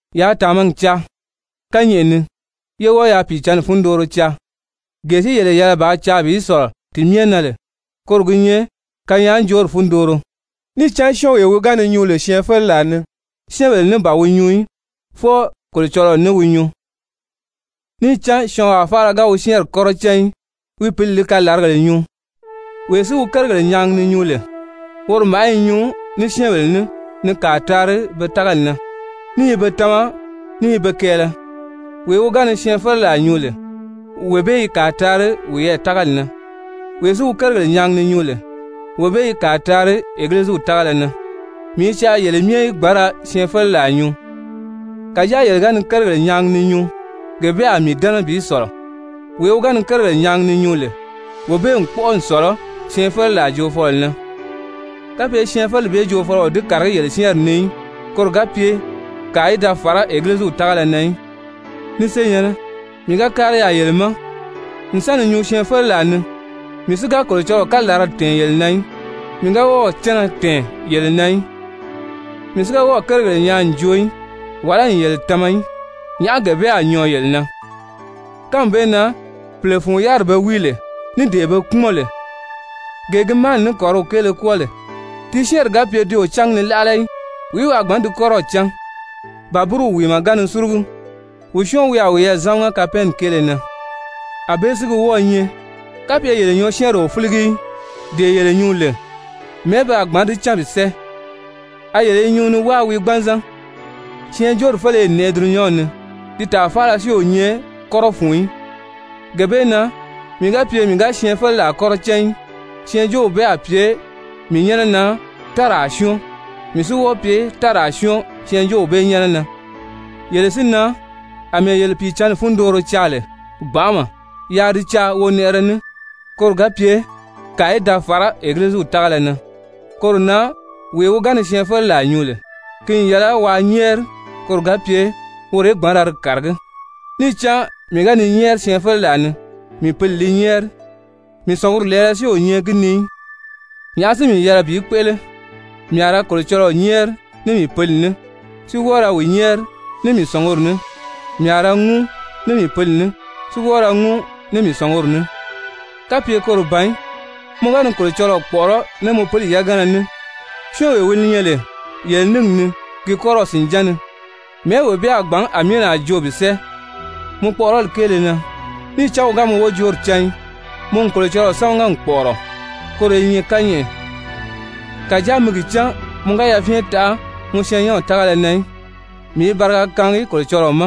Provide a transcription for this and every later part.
Yaa tàmagi caa kányɛʔɛ ni, yé wɔ́ɔ yaa Pìicǎnni fundooro caa. Gee si yele yɛlɛ bàā caa bi sɔ̀lɔ ti myɛ na lè koro gi nyɛ kanyaajoori fundooro. Níì cán syɔ́ɔnwee wi ga ni nyuu lè syɛɛnfeleraa ni, syɛ́ɛnbèle ní ban wi nyuu í, fwɔɔ Kolocɔlɔɔ ní wi nyuu, níì cán syɔɔnwaa faala ga wi syɛ́ɛnri kɔ́rɔ cán í, wi pǐli li kalaragèle nyuu. Wee si wi kérigèle nyaagi ni nyuu lè, woro màʔá i nyuu ní syɛ́ɛnbèle ní ni kàa taari be tágali na, ní i be tama ní i be kɛɛlɛ. Wee wi ga ni syɛɛnfeleraa nyuu lè, wee bee i kàa taari wiyɛɛ tágali na. Wee si wi kérigèle nyaagi ni nyuu lè, wee bee i kàa taari Egiliziw tágala na. Mii i caa yele myɛ í gbǎn ra syɛɛnfeleraa nyuu, kàjáa yele ga ni kérigèle nyaagi ni nyuu, gee bee a mii dɛ́nɛ bi sɔ̀lɔ. Wee wi ga ni kérigèle nyaagi ni nyuu lè, wee bee n kpɔ́ʔɔ n sɔ̀lɔ syɛɛnfeleraa joofɔlɔ na, kapye syɛɛnfeleri bee joofɔlɔ o di kàragí yele syɛ́ɛnri ni í, koro ga pye kàa í fàra Egiliziw tágala na í. Ni senyɛ̀nnɛ, mii ga kári yaà yele ma n sa ni nyuu syɛɛnfeleraa ni, mii si ga Kolocɔlɔɔ kalaralaa tɛ̀ɛn yele na í, mii ga wɔ́ɔ̀ cánna tɛ̀ɛn yele na í, mii si ga wɔ́ɔ̀ kérigèle nyaa n joo í wàlá n yele tama í, nyàʔá gee bee a nyɔɔ yele na? Kánmi bee na pìle fun yáriri be wíi lè, ní dee be kpúmɔn lè, gee gi máani ní kɔ̀ríw kéele kwɔ́ɔ lè, ti syɛ́ɛnri ga pye ti o cángi ni láʔala í, wìí wi a gbǎn di kɔ́rɔw cán? Ba búruw wìimɛ ga ni súrugu, wìí syɔ́ɔn wi a wiyɛɛ zámaga kapɛɛnni kéele na? Anbée gi wɔ́ɔ̄ nyɛ. Kapye yele nyɔɔsyɛɛnri o fíligi í, dee yele nyuu lè, mɛ̀ɛ́ pe a gbǎn di cán bi sɛ́ɛ? A yele nyuu ni wáa wii gbanzan. Syɛɛnjóori féleye n nɛʔɛ dulunyanw ni, ti tàa faala si o nyɛ kɔ́rɔ fun í. Gee bee na mii ga pye mii ga syɛɛnjóoraa kɔ́rɔ cán í, syɛɛnjóow bee a pye mii nyɛ́nɛ na táraa syɔ́ɔn, mii si wɔ́ɔ pye táraa syɔ́ɔn syɛɛnjóow bee nyɛ́nɛ na. Yele si na, àmɛɛ yele Pìicǎnni fundooro caa lè gbanʔama, yaa di caa wonɛʔɛrɛ ní, koro ga pye kàa í da fàrá Egiliziw tágala na. Koro na wee wi ga ni syɛɛnfeleraa nyuu lè, ki n yɛlɛ waa nyɛ́ɛri koro ga pye woro í gbǎn ra di kàragí. Níì cán mii ga ni nyɛ́ɛri syɛɛnfeleraa ni, mii pǐli li nyɛ́ɛri, mii sɔ̀nguri lɛɛlɛ si o nyɛ gi ni í. Nyàʔá si mii yɛlɛ bi kpéʔele? Mii a ra Kolocɔlɔɔ nyɛ́ɛri ní mii pǐli ní, si wɔ́ɔ ra wi nyɛ́ɛri ní mii sɔ̀nguri ní. Mii a ra ŋúu ní mii pǐli ní, si wɔ́ɔ ra ŋúu ní mii sɔ̀nguri ní. Kapye koro ban í, mɔ ga ni Kolocɔlɔɔ kpɔ̀ʔɔrɔ́ ní mɔ pili yagana ní, syɔ́ɔnwee wi nyɛ lè yele níngi ni ki kɔ́rɔw sìnján ni, mɛ̀ɛ́ wee bee a gbǎn amiina joo bi sɛ́ɛ mɔ kpɔʔɔrɔli kéele na níì cán wi ga mɔ wojoori cán í? Mɔ n Kolocɔlɔɔ sámaga n kpɔ̀ʔɔrɔ, koro i nyɛ kányɛʔɛ, kàjáa mi gi cán mɔ ga yafyɛn taʔa mɔ syɛɛnnyɛnw tágala na í. Mii i bariga kaangi Kolocɔlɔɔ ma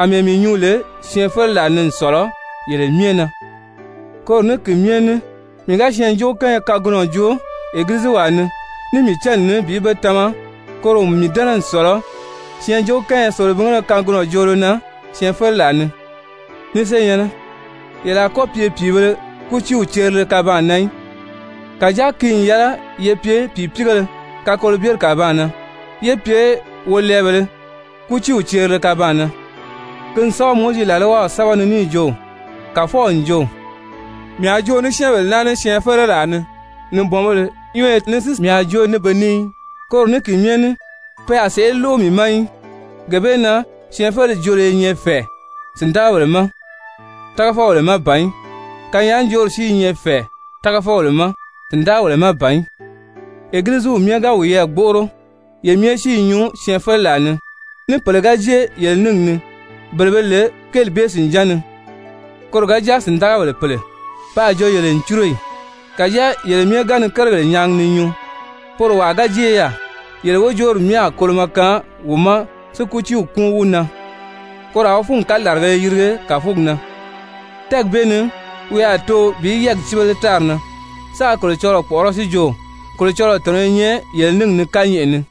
àmɛɛ mii nyuu lè syɛɛnfeleraa ni n sɔ̀lɔ yele myɛ na. Koro ní ki myɛ ní mii ga syɛɛnjóokánya kagunɔ joo Egiliziwaa ni ní mii cánni ní bi be tama, koro n mii dɛ́nɛ n sɔ̀lɔ syɛɛnjóokánya selebingéle kagunɔ joolo na syɛɛnfeleraa ni. Ni senyɛ̀nnɛ, yele a kɔ́ pye pìibēle kútiiw cerile kabaan na í, kàjáa ki n yɛlɛ ye pye pìipiigéle kakolobyeri kàbaan na, yé pye wolɛɛbèlē kútiiw cerile kabaan na. Ki n sɛ́bɛ Mowizi làlwaw sɛ́bɛ ni níì jo: «Kàfɔw n jo: ‹Mii a joo ní syɛ́ɛnbèle naa ní syɛɛnfeleraa ni. Nibɔnbéle nyɔ́ɔyɔ ni si mii a joo ní be ní. Koro ní ki myɛ ní pe a sèʔé lóʔo mii ma í.›» Gee bee na syɛɛnfeleri joolo i nyɛ fɛ̀ɛ sìndagabèle ma, tágafɔbèle má ban í. Kanyaajoori si i nyɛ fɛ̀ɛ tágafɔbèle ma, sìndagabèle má ban í. Egiliziw myɛ ga wiyɛɛ gbóʔoro ye myɛ si i nyuu syɛɛnfeleraa ni, ní pèle ga jée yele níngi ni, bele be lè kéeli bee sìnján ni, koro ga jáa sìndagabèle pèle, pe a jo yele n cúro ì? Kàjáa yele myɛ ga ni kérigèle nyaagi ni nyuu, poro wàa ga jée yaà, yele wojoori myɛ a kolomɔ kaan wi ma, si kútii kúun wi na. Koro a wi fúngi kalaragēle yirige kàfugi na. Tɛ́ɛgi bee ni wi a too bi yɛ́ɛgi cíbele tári na, sáā Kolocɔlɔɔ kpɔ̀ʔɔrɔ́, si jo: «Kolocɔlɔɔ tɔ̀nɔ i nyɛ yele níngi ni kányɛʔɛ ni.»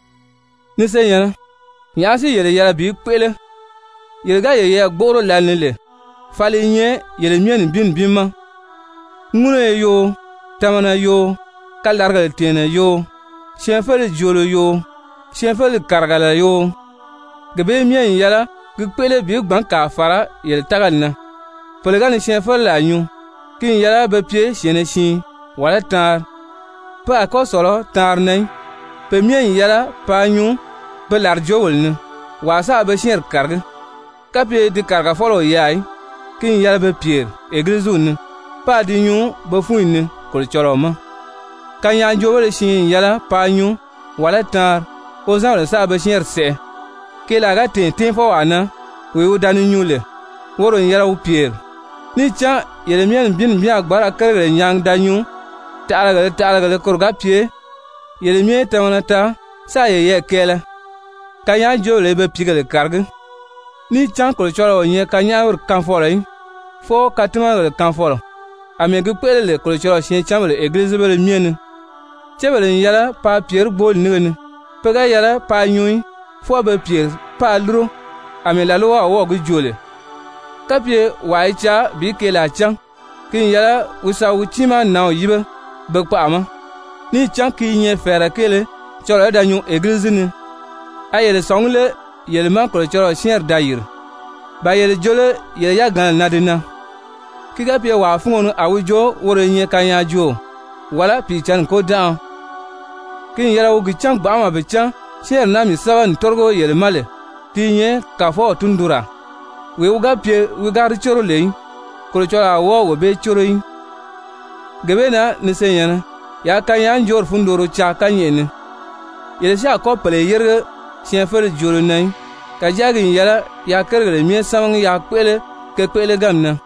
Ni senyɛ̀nnɛ, nyàʔá si yele yɛlɛ bi kpéʔele? Yele ga yeyɛɛ gbóʔoro lǎlee ni lè, fali i nyɛ yele myɛ nibin nibin ma, ŋúnugo yoo, tamana yoo, kalaragèle tɛ̀ɛnnɛ yoo, syɛɛnfeleri joolo yoo, syɛɛnfeleri kàrigala yoo, gee bee myɛ n yɛlɛ gi kpéʔele bi gbǎn kàa fàra yele tágali na. Pèle ga ni syɛɛnfeleraa nyuu, ki n yɛlɛ be pye syɛ̀ɛnnɛ siin wàlá taanri, pe a kɔ́ sɔ̀lɔ taanri na í. Pe myɛ n yɛlɛ paa nyuu pe làrijoogèle ni, wàa sáā be syɛ́ɛnri kàragí. Kapye di kàrigafɔlɔ o yaà í, ki n yɛlɛ be pyèri Egiliziw ni, páā di nyuu be fúnyi ni Kolocɔlɔɔ ma. Kanyaajoobéle siin n yɛlɛ paa nyuu, wàlá taanri, wozanbèle sáā be syɛ́ɛnri sɛʔɛ. Keelaa ga tɛ̀ɛn tɛ́ɛnfɔwaa na, wee wi da ni nyuu lè, woro n yɛlɛ wi pyèri. Níì cán yele myɛ nibin nibin a gbǎn ra kérigèle nyaagi da nyuu taʔalagèlē taʔalagèlē koro ga pye yele myɛ í tamana taa, sáā yeyɛɛ kɛɛlɛ. Kanyaajoobèle i be pìígèle kàragí. Níì cán Kolocɔlɔɔ o nyɛ kanyaʔamiri kaanfɔlɔ í, fwɔɔ katimanagèle kaanfɔlɔ. Amɛɛ gi kpéʔele lè Kolocɔlɔɔ syɛɛncanbèle egilizibéle myɛ ni, cébèle n yɛlɛ paa pyèrí gbooli nínge ni, pe ga yɛlɛ paa nyuu í. Fwɔɔ be pyèri páā lúro, àmɛɛ làlwaw wɔ́ɔ̀ gi joo lè. Kapye wàa i caa bi keelaa cán, ki n yɛlɛ wi sa wi tiimaa nǎnw yíbe be kpaʔa ma. Níì cán ki i nyɛ fɛ̀ɛrɛ kéele cɔlɔɔ í da nyuu egilizi ni. A yele sɔ̀ngí lé yele má Kolocɔlɔɔ syɛ́ɛnri da yìri? Ba yele jo lé yele yagana na di nan? Ki ga pye wàa fúngo ni a wi jo woro i nyɛ kanyaajooo, wàlá Pìicǎnni kôdanʔaɔ, ki n yɛlɛ wi gi cán gbanʔama bi cán, syɛ́ɛnri naa mii sɛ́bɛ n tórigo yele ma lè, ti i nyɛ Kàfɔw tundunraa. Wee si ga pye wi ga di córo lè í, Kolocɔlɔɔ a wɔ́ɔ wee bee córo í. Gee bee na ni senyɛ̀nnɛ, yaa kanyaajoori fundooro caa kányɛʔɛ ni. Yele si a kɔ́ pèle yérige syɛɛnfeleri joolo na í. Kàjáa ki n yɛlɛ yaa kérigèle myɛ sámagi yaa kpéʔele ke kpéʔeleganmi na.